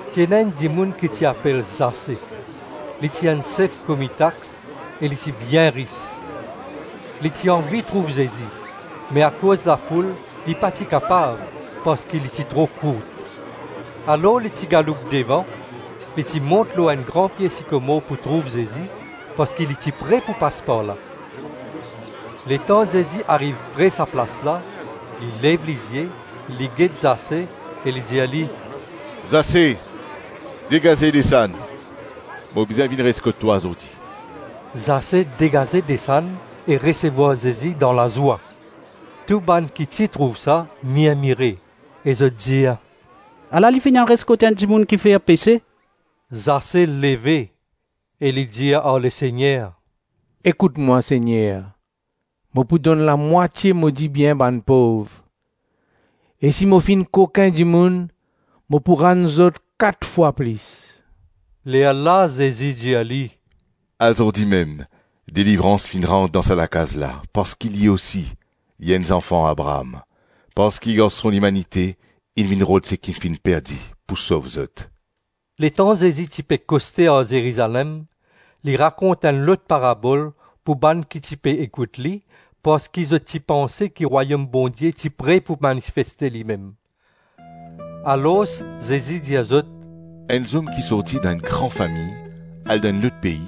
Ti ena enn dimoun ki ti apel Zase; li ti enn sef komi tax e li ti bien ris. Li ti anvi trouv Zezi, me akoz lafoul li pa ti kapav parski li ti tro kourt. Alors li ti galoup devan, li ti mont lor enn gran pie sikomor pou trouv Zezi parski li ti pre pou pas par la. Letan Zezi ariv pre sa plas la, li lev lizie, li get Zase, e li dir li, “Zase, degaze desann; mo bizin vinn res kot twa zordi.” Zase degaze desann e resevwar Zezi dan lazwa. Tou bann ki ti trouv sa mirmire e zot dir, “Ala li finn al res kot enn dimoun ki fer pese.” Zase leve e li dir ar Lesegner, “Ekout mwa, Segner. Mo pou donn lamwatie mo dibien bann pov; e si mo finn kokin dimoun, mo pou rann zot kat fwa plis.” Lerla Zezi dir li, “Azordi mem, delivrans finn rant dan sa lakaz la parski li osi, li enn zanfan Abraam. Parski Garson Limanite inn vinn rod seki finn perdi pou sov zot.” Letan Zezi ti koste ar Zerizalem, li rakont enn lot parabol pou bann ki ti pe ekout li parski zot ti panse ki Rwayom Bondie ti pre pou manifeste limem. Alors Zezi dir zot, “Enn zom ki sorti dan enn gran fami al dan enn lot pei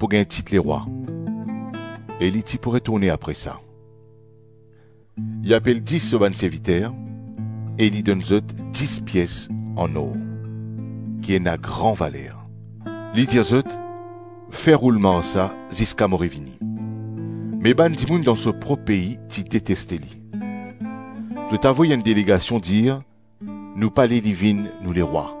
pou gagn tit lerwa e li ti pou retourne apre sa. Li apel dis so bann serviter, e li donn zot dis pies an-or, ki ena gran valer. Li dir zot, ‘Fer roulman ar sa ziska mo revini.’ Me bann dimoun dan so prop pei ti deteste li. Zot avoy enn delegasion dir, ‘Nou pale li vinn nou lerwa.’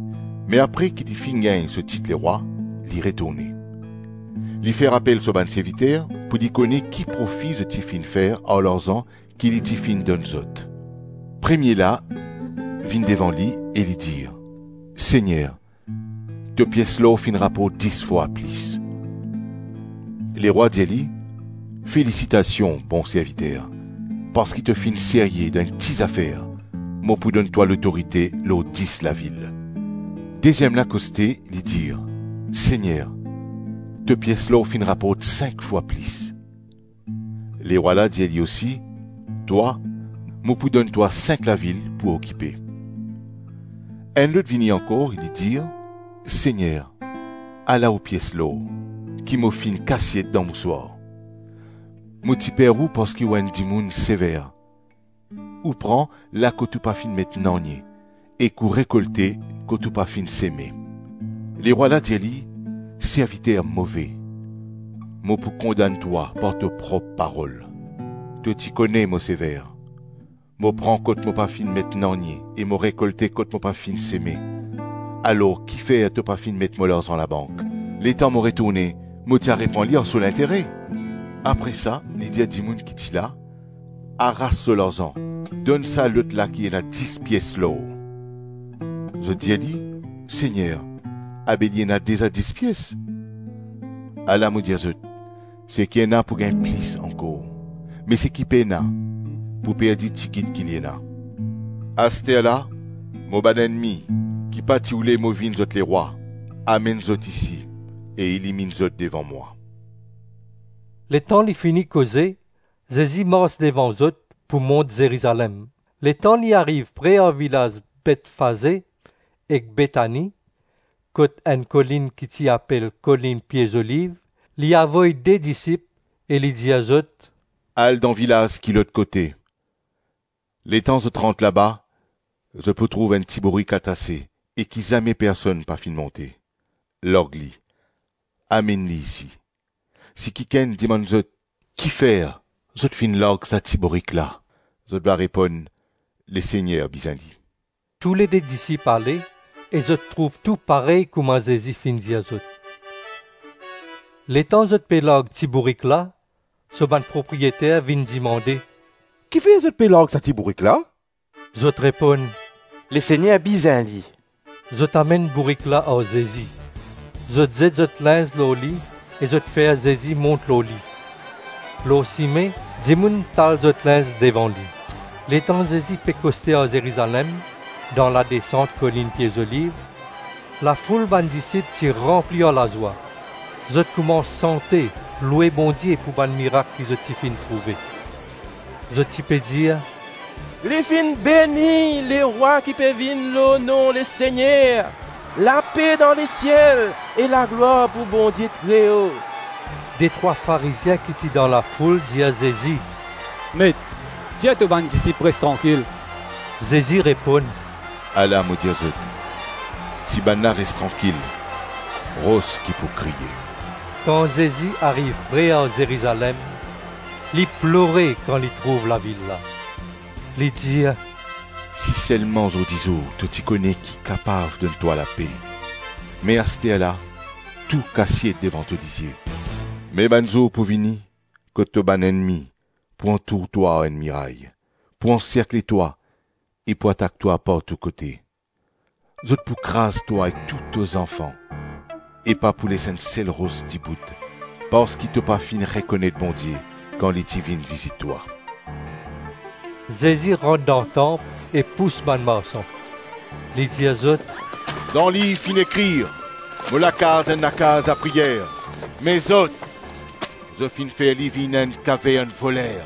Me apre ki li finn gagn so tit lerwa, li retourne. Li fer apel so bann serviter pou li kone ki profi zot ti finn fer ar larzan ki li ti finn donn zot. Premie la vinn devan li, e li dir, ‘Segner, to pies lor finn raport dis fwa plis.’ Lerwa dir li, ‘Felisitasion, bon serviter! Parski to finn serye dan enn ti zafer, mo pou donn twa lotorite lor dis lavil.’ Deziem la koste, li dir, ‘Segner, to pies lor finn raport sink fwa plis.’ Lerwa la dir li osi, ‘Twa, mo pou donn twa sink lavil pou okipe.’ Enn lot vini ankor e li dir, ‘Segner, ala ou pies lor, ki mo finn kasiet dan mouswar. Mo ti per ou parski ou enn dimoun sever; ou pran la kot ou pa finn met nanye ek ou rekolte kot ou pa finn seme.’ Lerwa la dir li, ‘Serviter move, mo pou kondann twa par to prop parol. To ti kone mo sever, mo pran kot mo pa finn met nanye e mo rekolte kot mo pa finn seme. Alors kifer to pa finn met mo larzan labank; letan mo retourne mo ti a repran li ar so lintere?’ Apre sa li dir dimoun ki ti la, ‘Aras so larzan, donn sa lot la ki ena dis pies lor.’ Zot dir li, ‘Segner, abe li ena deza dis pies!’ ‘Ala mo dir zot, seki ena pou gagn plis ankor, me seki pena, pou perdi tigit ki li ena. Asterla, mo bann ennmi, ki pa ti oule mo vinn zot lerwa, amenn zot isi e eliminn zot devan mwa.’” Letan li fini koze, Zezi mars devan zot pou mont Zerizalem. Letan li ariv pre ar vilaz Betfaze ek Betani, kot enn kolinn ki ti apel kolinn Pie Zoliv, li avoy de disip e li dir zot, “Al dan vilaz ki lot kote. Letan zot rant laba, zot pou trouv enn ti bourik atase e ki zame personn pa finn monte. Larg li, amenn li isi. Si kikenn dimann zot, ‘Kifer zot finn larg sa ti bourik la?’, zot va reponn, ‘Lesegner bizin li.’” Toulede disip ale e zot trouv tou parey kouma Zezi finn dir zot. Letan zot pe larg ti bourik la, so bann propriyeter vinn dimande, “Kifer zot pe larg sa ti bourik la?” Zot reponn, “Lesegner bizin li.” Zot amenn bourik la ar Zezi; zot zet zot linz lor li e zot fer Zezi mont lor li. Lor sime, dimoun tal zot linz devan li. Letan Zezi pe koste ar Zerizalem, dan ladesant kolinn Pie Zoliv, lafoul bann disip ti ranpli ar lazwa; zot koumans sante, loue Bondie, pou bann mirak ki zot ti finn trouve. Zot ti pe dir, “Li finn beni Lerwa ki pe vinn lor nom Lesegner! Lape dan lesiel e laglwar pou Bondie Treo!” Detrwa Farizien ki ti dan lafoul dir Zezi, “Met, dir to bann disip res trankil.” Zezi reponn, “Ala mo dir zot, si bannla res trankil, ros ki pou kriye.” Kan Zezi ariv pre ar Zerizalem, li plore kan li trouv lavil la. Li dir, “Si selma zordizour to ti kone ki kapav donn twa lape; me asterla, tou kasiet devan to lizie. Me bann zour pou vini kot to bann ennmi pou antour twa ar enn miray, pou anserkle twa e pou atak twa partou kote. Zot pou kraz twa ek tou to zanfan, e pa pou les enn sel ros dibout, parski to pa finn rekonet Bondie kan li ti vinn vizit twa.” Zezi rant dan tanp e pous bann marsan. Li dir zot, “Dan liv finn ekrir, ‘Mo lakaz enn lakaz lapriyer.’ Me zot, zot finn fer li vinn enn kavern voler.”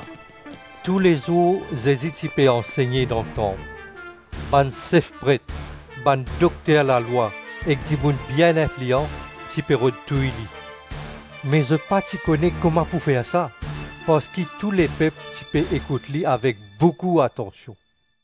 Toulezour Zezi ti pe ansegne dan tanp. Bann sef pret, bann dokter lalwa ek dimoun bien inflian ti pe rod touy li. Me zot pa ti kone kouma pou fer sa, parski tou lepep ti pe ekout li avek boukou atansion.